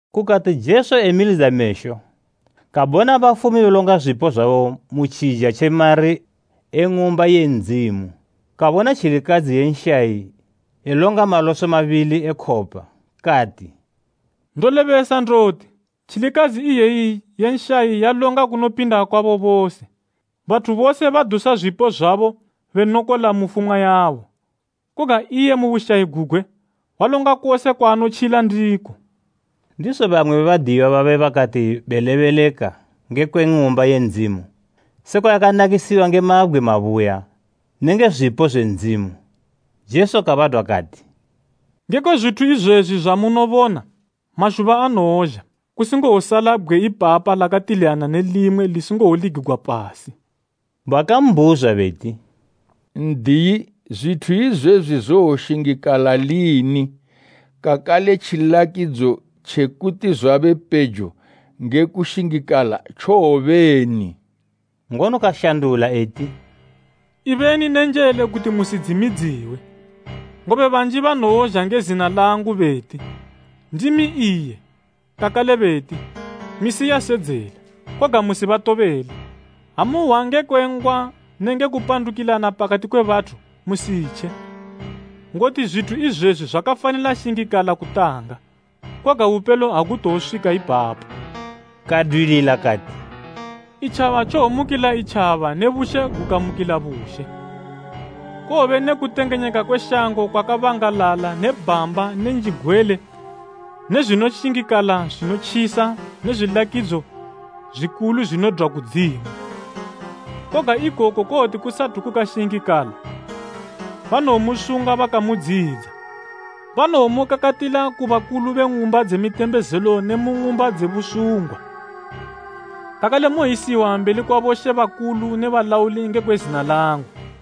Kukati Jesu emilidza mesho, kabona bafumi belonga zwipo zwabo mutjija tje mari e Ng'umba ye Ndzimu. Kabona tjilikadzi ye nshayi elonga maloso mabili e khopa. Kati, “Ndolebesa ndoti, tjilikadzi iyeyi ye nshayi yalonga kunopinda kwabo bose. Bathu bose badusa zwipo zwabo benokola mu fumwa yabo, koga iye mu bushayi gugwe, walonga kose kwaanotjila ndiko.” Ndizo bamwe be badiyiwa babe bakati belebeleka ngekwe Ng'umba ye Ndzimu, sekwa yakanakisiwa nge mabgwe mabuya nenge zwipo zwe Ndzimu, Jesu kabadwa kati, “Ngekwe zwithu izwezwi zwamunobona, mazhuba anowozha, kusingowosala bgwe ipapa lakatiliyana ne limwe, lisingowoligigwa pasi.” Bakambhuzwa beti, “N'diyi, zwithu izwezwi zowoshingikala lini? Kakale tjilakidzo tjekuti zwabe pejo nge kushingikala tjowobeni?” Ngono kashandula eti, “Ibeni ne njele kuti musidzimidziwe, ngobe banji banowozha nge zina langu beti, ‘Ndimi iye,’ kakale beti, ‘Misi yasedzela.’ Koga musibatobele. Ha muhwa ngekwe ngwa nenge kupandukilana pakati kwe bathu, musitje. Ngoti zwithu izwezwi zwakafanila shingikala kutanga, koga bupelo agutowoswika ipapo.” Kadwilila kati, “Itjaba tjowomukila itjaba ne bushe gukamukila bushe. Kowobe ne kutengenyeka kwe shango kwakabangalala ne bhamba ne njigwele ne zwinoshingikala zwinotjisa ne zwilakidzo zwikulu zwinodwa kudzimu. Koga ikoku kowoti kusathu kukashingikala, banomusunga bakamudziyidza. Banowomukakatila ku bakulu be ng'umba dze mitembezelo ne mu ng'umba dze busungwa, kakale mowoyisiwa mbeli kwa bomambo ne balauli ngekwe zina langu.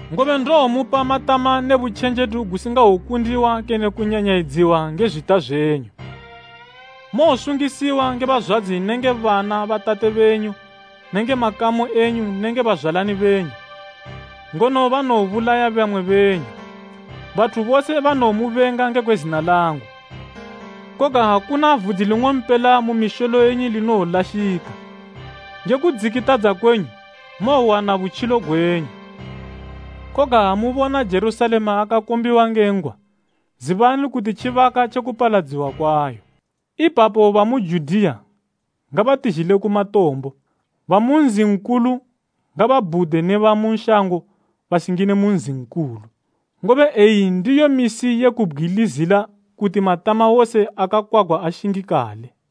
Ngobe ndowomupa matama ne butjenjedu gusingawokundiwa kene kunyanyayidziwa nge zwita zwenyu. Mowosungisiwa nge bazwadzi nenge bana ba tate benyu nenge makamu enyu nenge bazwalani benyu, ngono banowobulaya bamwe benyu. Bathu bose banowomubenga ngekwe zina langu. Koga akuna vudzi ling'ompela mu misholo yenyu linowolashika. Nge kudzikitadza kwenyu, mowowana butjilo gwenyu. “Koga ha mubona Jerusalema yakakombiwa nge ngwa, zibani kuti tjibaka tje kupaladziwa kwayo. Ipapo bamu Judiya ngabatizhile ku matombo, ba mu nzi nkulu ngababhude ne bamu shango basingine mu nzi nkulu. Ngobe eyi ndiyo misi ye kubgwilizila kuti matama wose akakwagwa ashingikale.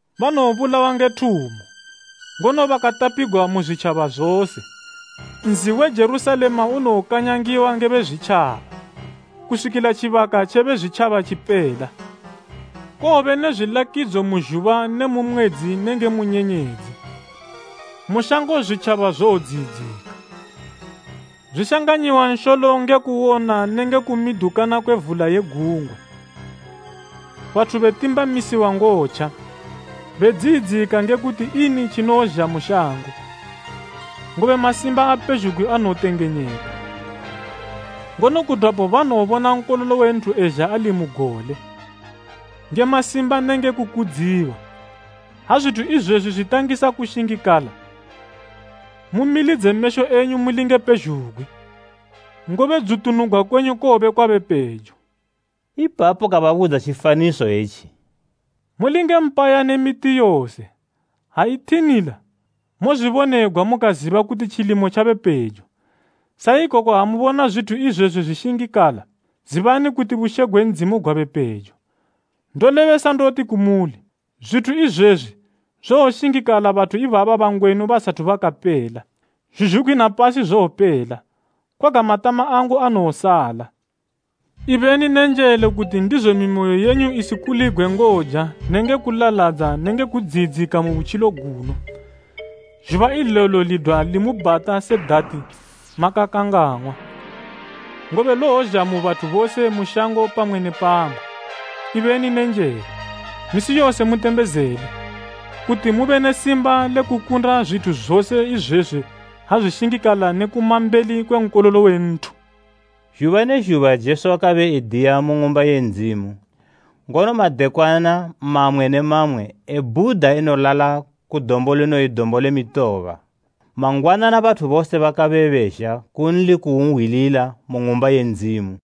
Banowobulawa nge thumo, ngono bakatapigwa mu zwitjaba zose. Nzi we Jerusalema unowokanyangiwa nge Bezwitjaba, kuswikila tjibaka tjebe Bezwitjaba tjipela.” “Kowobe ne zwilakidzo mu zhuba ne mu mwedzi nenge mu nyenyedzi. Mu shango zwitjaba zowodziyidzika, zwishanganyiwa nsholo nge kuwona nenge kumidukana kwe vula ye gungwa. Bathu betimbamamisiwa ngotja, bedziyidzika nge kuti ini tjinozha mu shango, ngobe masimba apezhugwi anowotengenyeka. Ngono kudwapo banowobona Nkololo we Nthu ezha ali mu gole, nge masimba nenge kukudziwa. Ha zwithu izwezwi zwitangisa kushingikala, mumilidze mesho yenyu mulinge pezhugwi, ngobe dzutunugwa kwenyu kowobe kwabe pejo.” Ipapo kababudza tjifaniso etji, “Mulinge mpaya ne miti yose. Ha ithinila, mozwibonegwa mukaziba kuti tjilimo tjabe pejo. Sa ikoko ha mubona zwithu izwezwi zwishingikala, zibani kuti bushe gwe Ndzimu gwabe pejo. “Ndolebesa ndoti kumuli, zwithu izwezwi zowoshingikala bathu ibaba bangwenu basathu bakapela. Zhuzhugwi na pasi zowopela, koga matama angu anowosala.” “Ibeni nenjele kuti ndizo mimoyo yenyu isikuligwe ngoja nenge kulaladza nenge kudziyidzika mu butjilo guno, zhuba ilelo lidwa limubhata se dati makakangang'wa, ngobe lowozha mu bathu bose mu shango pamwe ne pamwe. Ibeni nenjele, misi yose mutembezele, kuti mube ne simba le kukunda zwithu zose izwezwi ha zwishingikala ne kuma mbeli kwe Nkololo we Nthu.” Zhuba ne zhuba Jesu wakabe ediya mu Ng'umba ye Ndzimu, ngono madekwana mamwe ne mamwe ebhuda enolala ku dombo linoyi Dombo le Mitoba. Mangwanana bathu bose bakabe bezha kunli kuwunhwilila mu Ng'umba ye Ndzimu.